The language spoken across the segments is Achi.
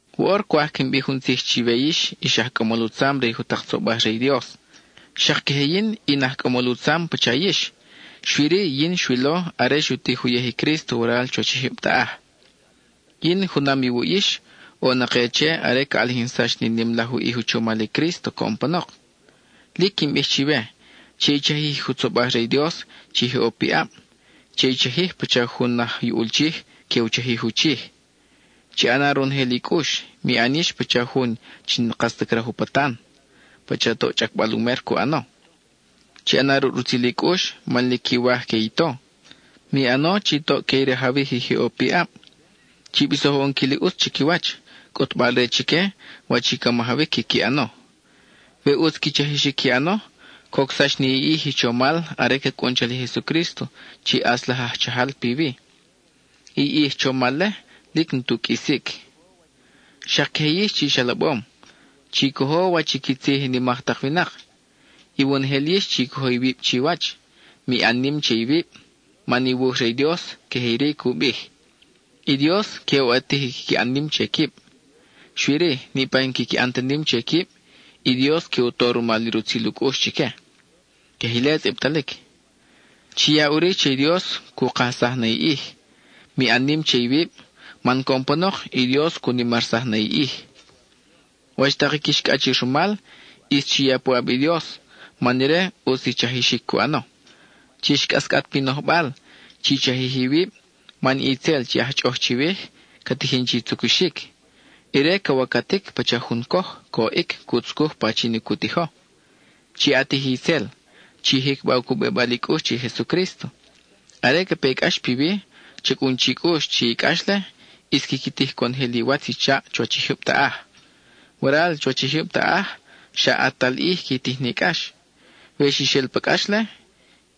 Woʼor cwaj quin bij jun tzij chiwe yix ix aj cʼamol u tzam re i jutak tzobaj re i Dios. Xak queje yin in aj cʼamol u tzam pacha yix, xui-ri yin xwilo are xu tij uyej i Crísto waral chuwach i jyub taʼaj. Yin, junam iwuʼ yix, ʼo na ke che are ca ʼalijinsax ni nim laj u ʼij u chomal i Crísto coʼon panok. Lic quin bij chiwe: che i chajij i jutzobaj re i Dios chi je ʼo piʼab; che i chajij pacha jun aj yuʼul chij que u chajij u chij. Chi ʼana ronojel i cʼux; mi ʼan yix pacha jun chi n-kas ta craj u patan, pacha toʼ chʼacbal u mer cu ʼano. Chi ʼana ruʼ rutzil i cʼux man lic quiwaj que i to. Mi ʼano chi toʼ que i rajawij i je ʼo piʼab. Chi bisoj u ʼonquil i ʼutz chiquiwach, cʼutbal-re chique wach i ca majawic quiqui ʼano. We ʼutz qui chajixic qui ʼano, cocsax ni i ʼij i chomal are ca cʼun chal i Jesucrísto chi ʼAtz laj aj Chajal piwi; i ʼij chomal-le lic n-tu qʼuisic. Xak queje yix chi ix alabom: chi cojo wach i qui tzij i nimak tak winak. Iwonojel yix chi cojo iwib chiwach; mi ʼan nim che iwib, man i wuj re i Dios queje iri cu bij: I Dios que u ʼatij i quiqui ʼan nim che quib, xui-ri, niʼpa i n-quiqui ʼan ta nim che quib, i Dios que u to rumal i rutzil u cʼux chique. (Queje ile tzʼibtalic.) Chi ya ʼuri che i Dios cu kajsaj na i ʼij; mi ʼan nim che iwib, man coʼon panok i Dios cu nimarsaj na i ʼij. Wach tak i quix cʼachir rumal, ʼis chi ya puʼab i Dios man ire ʼutz i chajixic cu ʼano. Chix cʼascʼat pi nojbal, chi chajij iwib, man i itzel chi aj chʼoʼoj chiwij, ca tijin chi tzucuxic. Ire ca wacatic pacha jun coj, coʼic cu tzucuj pachin i cu tijo. Chi ʼatij i itzel; chi jicba u cubibal i cʼux che i Jesucrísto. Are ca pe i cʼax piwi, cha cʼun chi cʼux chi i cʼax-le ʼis quiqui tij conojel iwatz i chaʼ chuwach i jyub taʼaj. Waral chuwach i jyub taʼaj, xa ʼatal ʼij qui tij ni cʼax; we xix el pa cʼax-le,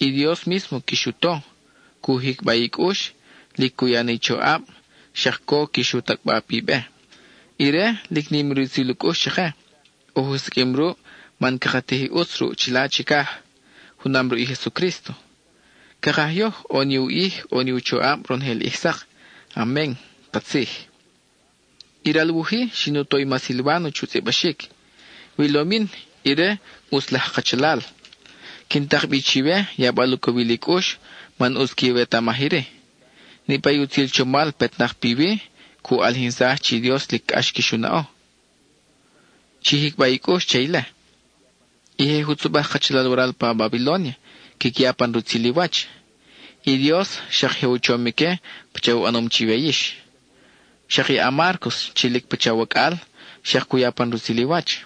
i Dios mísmo quix u to; cu jicba i cʼux, lic cu ya na i choʼab, xak co quix u tacʼba pi be. Ire, lic nim i rutzil u cʼux chake, oj u siqʼuim ruʼ man caka tij i ʼutz ruʼ chila chicaj, junam ruʼ i Jesucrísto. Cakaj yoj ʼo ni u ʼij, ʼo ni u choʼab ronojel ʼij sak. Amen (katzij). I ral wuj-i, xin u to i ma Silváno chu tzʼibaxic; wilom yin, ire ʼutz laj kachalal. Quin tak bi chiwe, yabal u cowil i cʼux man ʼutz quiwetamaj iri: niʼpa i utzil chomal petnak piwi, cu ʼalijinsaj chi i Dios lic cʼax quix u naʼo. Chi jicba i cʼux che ile. I je jutzobaj kachalal waral pa Babilónia quiqui ya pan rutzil i wach. I Dios xak je u chom ique pacha u ʼanom chiwe yix. Xak i a-Márcos chi lic pacha wacʼal, xak cu ya pan rutzil i wach.